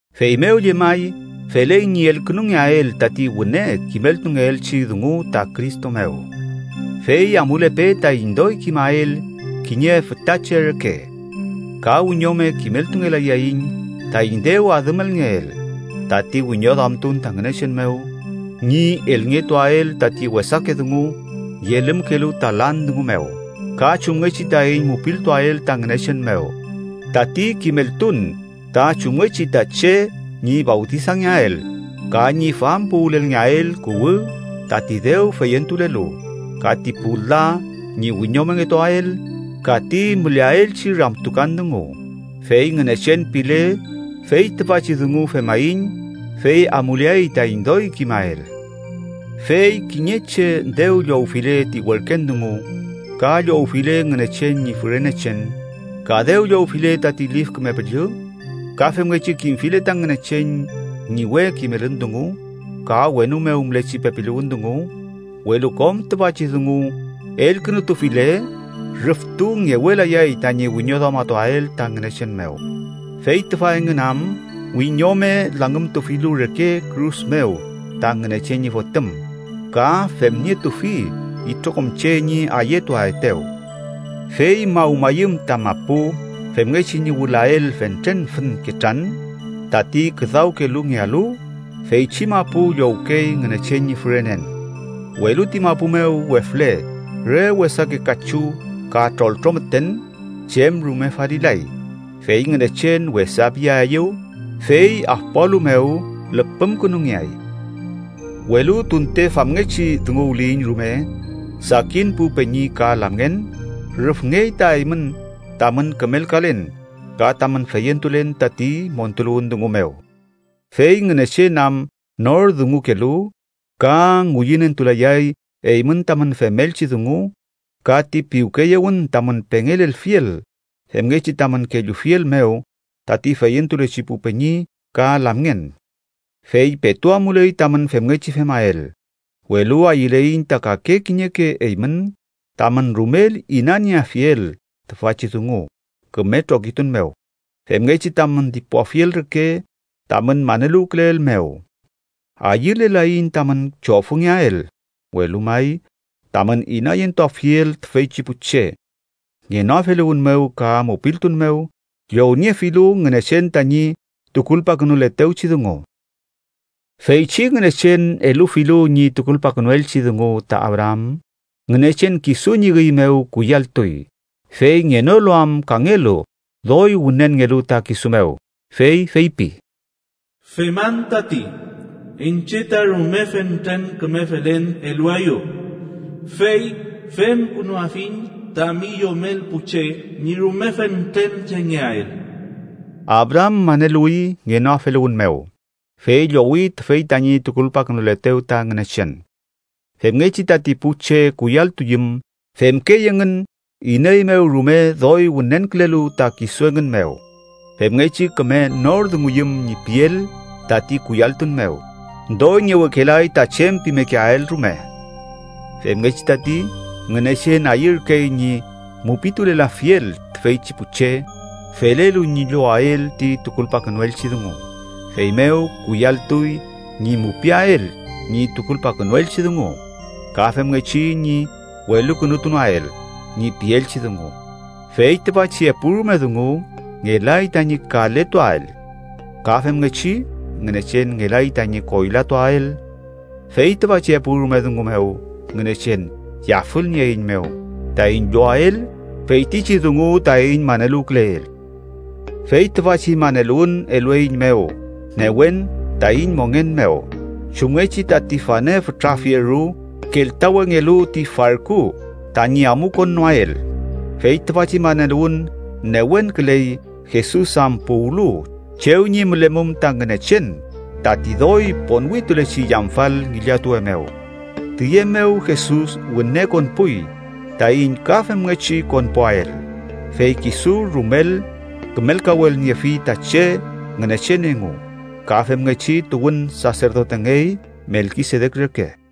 Feymew llemay, feley ñi elkünungeael tati wüne kimeltungeelchi dungu ta Cristo mew, fey amulepe taiñ doy kimael kiñe fütache reke. Ka wiñome kimeltungelayaiñ taiñ dew adümelngeel, tati wiñoduamtun ta Ngünechen mew, ñi elngetuael tati wesake dungu yelümkelu ta lan dungu mew, ka chumngechi taiñ mupiltuael ta Ngünechen mew, tati kimeltun ta chumngechi ta che ñi fawtisangeael, ka ñi fampuwülelngeael kuwü tati dew feyentulelu, ka ti pu la ñi wiñomongetuael ka ti müleaelchi ramtukan dungu. Fey Ngünechen pile, fey tüfachi dungu femaiñ, fey amuleay taiñ doy kimael. Fey kiñe che dew llowfile ti werken dungu, ka llowfile Ngünechen ñi fürenechen, ka dew llowfile tati Lif Küme Püllü, ka femngechi kimfile ta Ngünechen ñi we kimelün dungu, ka wenu mew mülechi pepiluwün dungu, welu kom tüfachi dungu elkünutufile, rüftu ngewelayay tañi wiñoduamatuael ta Ngünechen mew. Fey tüfa engün am wiñome langümtufilu reke kürus mew ta Ngünechen ñi Fotüm ka femnietufi itrokom che ñi ayetuaetew. Fey mawmayüm ta mapu femngechi ñi wülael fentren fün ketran tati küdawkelungealu, feychi mapu llowkey Ngünechen ñi fürenen, welu ti mapu mew wefle re wesake kachu ka troltro müten, chem rume falilay, fey Ngünechen wesa piaeyew, fey afpualu mew lüpümkünungeay. Welu tunte famngechi dunguwliyiñ rume, sakin pu peñi ka lamngen, rüfngey ta eymün tamün kümelkalen ka tamün feyentulen tati montuluwün dungu mew. Fey Ngünechen am nor dungukelu, ka ngüyünentulayay eymün tamün femelchi dungu ka ti piwkeyewün tamün pengelelfiel femngechi tamün kellufiel mew tati feyentulechi pu peñi ka lamngen. Fey petu amuley tamün femngechi femael. Welu ayüleiñ ta kake kiñeke eymün tamün rumel inanieafiel tüfachi dungu küme trokitun mew, femngechi tamün dipuafiel reke tamün maneluwküleel mew. Ayülelaiñ tamün chofüngeael, welu may tamün inayentuafiel tüfeychi pu che ngenoafeluwün mew ka mupiltun mew llowniefilu Ngünechen tañi tukulpakünuletewchi dungu. Feychi Ngünechen elufilu ñi tukulpakünuelchi dungu ta Abraam, Ngünechen kisu ñi üy mew kuyalltuy. Fey ngenolu am kangelu doy wünenngelu ta kisu mew, fey feypi: “Feman tati, iñche ta rume fentren küme felen eluaeyu, fey femkünuafiñ tami yomel pu che ñi rume fentren chengeael.” Abraam maneluwi ngenoafeluwün mew, fey llowi tüfey tañi tukulpakünuletew ta Ngünechen. Femngechi tati pu che kuyalltuyüm, femkey engün iney mew rume doy wünenkülelu ta kisu engün mew. Femngechi küme nor dunguyüm ñi piel tati kuyalltun mew, doy ngewekelay ta chem pimekeael rume. Femngechi tati, Ngünechen ayürkey ñi mupitulelafiel tüfeychi pu che felelu ñi llowael ti tukulpakünuelchi dungu, feymew kuyalltuy ñi mupiael ñi tukulpakünuelchi dungu ka femngechi ñi welukünutunoael ñi pielchi dungu. Fey tüfachi epurume dungu ngelay tañi kaletuael, ka femngechi Ngünechen ngelay tañi koylatuael. Fey tüfachi epurume dungu mew Ngünechen yafülnieeiñmew taiñ llowael feytichi dungu taiñ maneluwküleel. Fey tüfachi maneluwün elueiñmew newen taiñ mongen mew, chumngechi tati fane fütra fieru keltawengelu ti farku tañi amukonnoael. Fey tüfachi maneluwün newenküley Jesus am puwlu chew ñi mülemum ta Ngünechen tati doy ponwitulechi yamfal ngillatuwe mew, tiye mew Jesus wüne konpuy taiñ ka femngechi konpuael, fey kisu rumel kümelkawelniefi ta che Ngünechen engu ka femngechi tuwün saserdotengey Melkisedek reke.